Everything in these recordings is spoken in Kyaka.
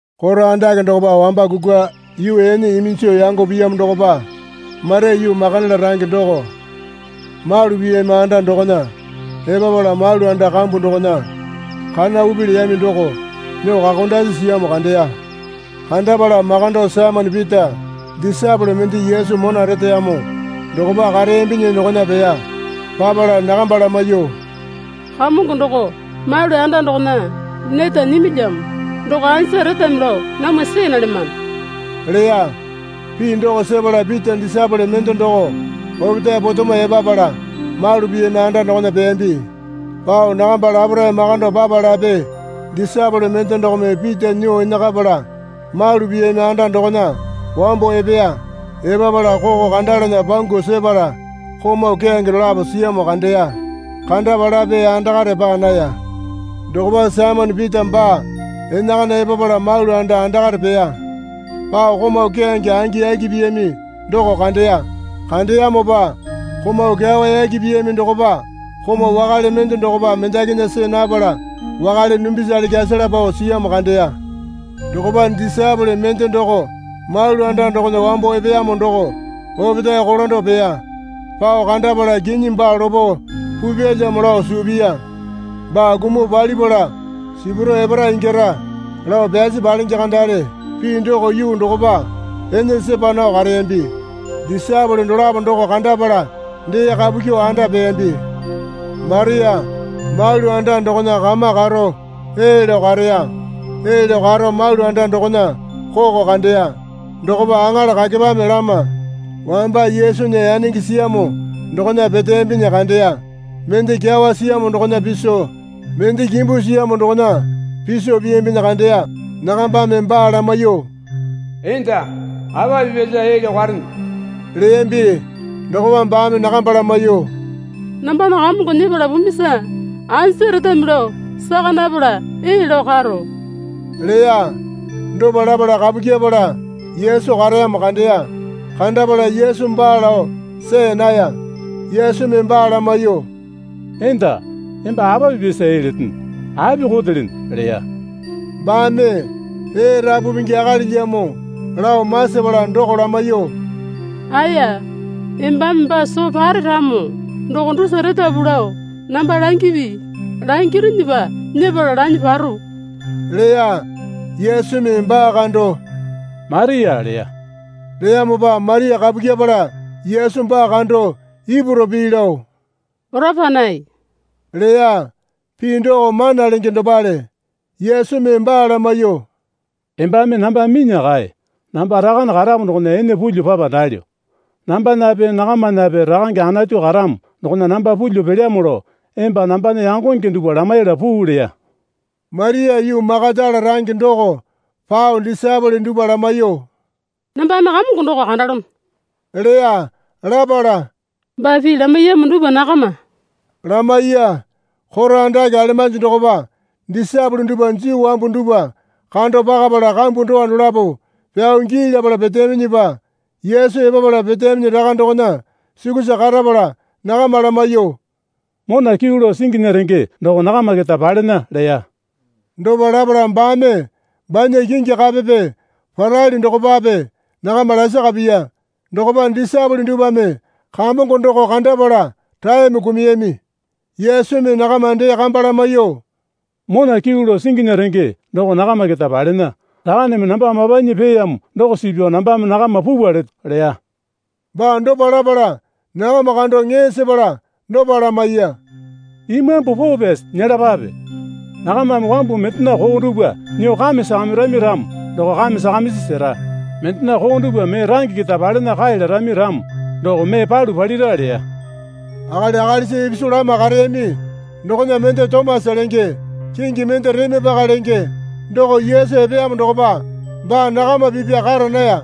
Koro andake dokopa wamba kukwa yuu ene iminjo yango piyamo dokopa Maria yuu Makatala range doko malu piyami anda dokona epapala malu anda kambu dokona kana upi leyami doko nyuo kakondasi siyamo kandeya. Kandapala makando Saimone Pita disaepole mende Yesu mona reteyamo dokopa kareyambinyi dokona peya. Papala nakamba lamaiyuo, Kamongo doko malu anda dokona neta nyimilyamo. Doko anja retami lao namwa see nalyamano leya. Pii doko sepala Pita disaepole mende doko opetae potemo epapala malu piyami anda dokona peyambi. Pao nakamba laparae makando papalape disaepole mende dokome Pita nyuo enakapala malu piyami anda dokona wambo epeya. Epapala koko kandalana pangu sepala komau keyange dolapo siyamo kandeya. Kandapalape andakare paa naya. Dokopa Saimone Pita baa enakana epapala malu anda andakare peya. Pao komau keyange angi yaki piyami doko kandeya. Kandeyamopa komau kyawa yaki piyami dokopa komau wakale mende dokopa mendakinya see napala wakale dumbisale kyasala pao siyamo kandeya. Dokopa disaepole mende doko malu anda dokona wambo epeyamo doko opetae kolando peya. Pao kandapala kinyi baa lopo pupyalyamo lao suu piya. Baa kumuo palipala sipuro epara ingyara, lao pyasi palenge kandale pii doko yuu dokopa ene sepa nao kareyambi. Disaepole dolapo doko kandapala dee kapu kyuo anda peyambi. Maria malu anda dokona kama karo ee lao kareya. Ee lao karo malu anda dokona koko kandeya. Dokopa aŋala kakepame lama wamba Yesunya yanenge siyamo dokona peteyambi kandeya. Mende kyawa siyamo dokona piso mende kimbu siyamo dokona piso piyambinyi kandeya. Nakambame baa lamaiyuo, Enda apa pipyasa ee lao karene? leyambi. Dokopa baame nakamba lamaiyuo, Nambana Kamongo nyepala pumisa anja retami lao saka napala ee lao karo leya. Dopa lapala kapu kyepala Yesu kareyamo kandeya. Kandapala Yesu baa lao see naya. Yesumi baa lamaiyuo, Enda, emba apa pipyasa ee letene? Api kotelene? leya. Baame ee rapu pingi akalilyamo lao masapala doko lamaiyuo, Aeya, embame baa soo pare ramo doko dusa retapu lao namba langipi. Langirinyipa nyepala lanyuo paro leya. Yesumi baa kando, Maria leya. Leyamopa Maria kapu kyepala Yesu baa kando Ipuru pii lao, Oraponai leya (pii doko Mana Lenge dopale.) Yesumi baa lamaiyuo, Embame namba minya kae. Namba Rakane karamo dokona ene pulyuo papa nalyo. Nambanape nakamanape Rakange Anatu karamo dokona namba pulyuo pelyamo lao emba nambana yangonge dupwa lamaiyala puu leya. Maria yuu Makatala range doko pao disaepole dupwa lamaiyuo, Nambame Kamongo doko kandalono, leya. Lapala, Baa pii lamaiyamo dupwa nakama lamaiya. Koro andake alemanji dokopa disaepole dupwa Juu wambu dupwa kando pakapala kambu dowa dolapo pyao gii lapala peteyaminyipa Yesu epapala peteyaminyi raka dokona sukusa karapala nakama lamaiyuo, Mona kyuu lao singinya renge doko nakama keta palena, leya. Dopa lapala baame banya kingi kapepe parali dokopape nakama lasaka piya. Dokopa disaepole dupwame Kamongo doko kandapala raeme kumuyami. Yesumi nakama dee kamba lamaiyuo, Mona kyuu lao singinya renge doko nakama keta palena. Rakaneme namba mapanyi peeyamo doko suu pyao nambame nakama pupwa leto leya. Baa dopa lapala nakama kando ŋee sepala dopa lamaiya. Imambu Poo Pyasi nyelapape. Nakamame wambu mendena koo dupwa nyuo kame sakamirami ramo doko kame sakamisi sera. Mendena koo dupwa mee range keta palena kae larami ramo doko mee palu palira leya. Akali akalisa ipisu lama kareyami dokona mende Tomasa lenge kingi mende Reme Paka lenge doko Yesu epeyamo dokopa baa nakama pipya kara naya.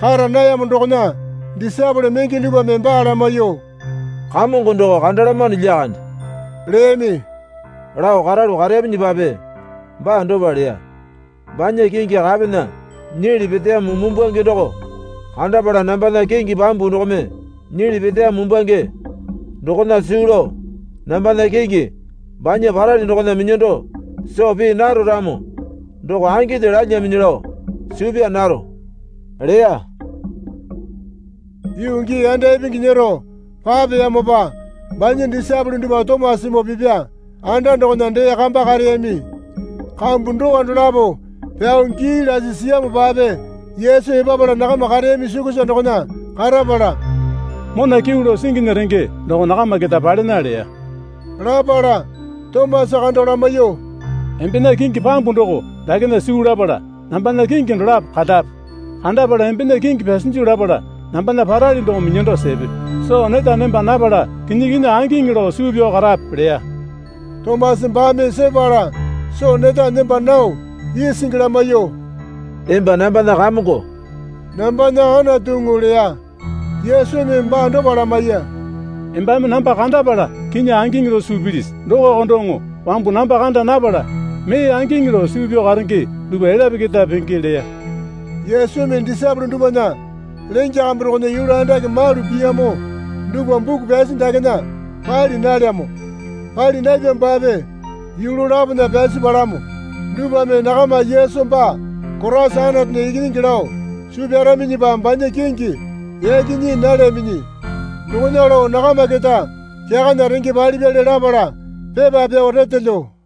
Kara nayamo dokona disaepole menge dupwame baa lamaiyuo, Kamongo doko kandalamano lyakande, leyami. Lao karalu kareyaminyipape baa dopa leya. Banya kingi kapena nyili peteyamo mumbwange doko kandapala nambana kingi pambu dokome nyili peteyamo mumbwange dokona suu lao nambana kingi banya parali dokona minyando soo pii naro ramo doko anginde lalyaminyi lao suu pyaa naro, leya. Yuu gii yanda ipingi nyero papeyamopa banya disaepole dupwa Tomasamoo pipya anda dokona dee kamba kareyami. Kambu dowa dolapo pyao gii lasi siyamopape Yesu epapala nakama kareyami sukusa dokona karapala, Mona kyuu lao singinya renge doko nakama keta palena leya. Lapala Tomasa kando lamaiyuo, Embena kingi pambu doko dakena suu lapala, nambana kingi dolapo kandape. Kandapala embena kingi pyasinju lapala nambana parali doko minyando sepe. Soo neta nemba napala kinyi kinyi angiŋi lao suu pyao karape leya. Tomasa baame sepala soo neta nemba nao isingi lamaiyuo, Emba nambana Kamongo, nambana Anatuŋu leya. Yesumi baa dopa lamaiya. Embame namba kandapala kinyi angiŋi lao suu pilisi? Dokoko doŋo wambu namba kanda napala mee angiŋi lao suu pyao karenge dupwa elyape keta penge leya. Yesumi disaepole dupwana lenge kambu dokona yulu andake malu piyami dupwa buku pyasi dakena pali nalyamo. Pali napyamopape yulu lapona pyasi palamo dupwame nakama Yesu baa Koraisa Anatunya Ikinyingi lao suu pyaraminyipa banya kingi yaki nyii nalyaminyi dokona lao nakama keta kyakana renge palipyali lapala pepa pyao retelyo.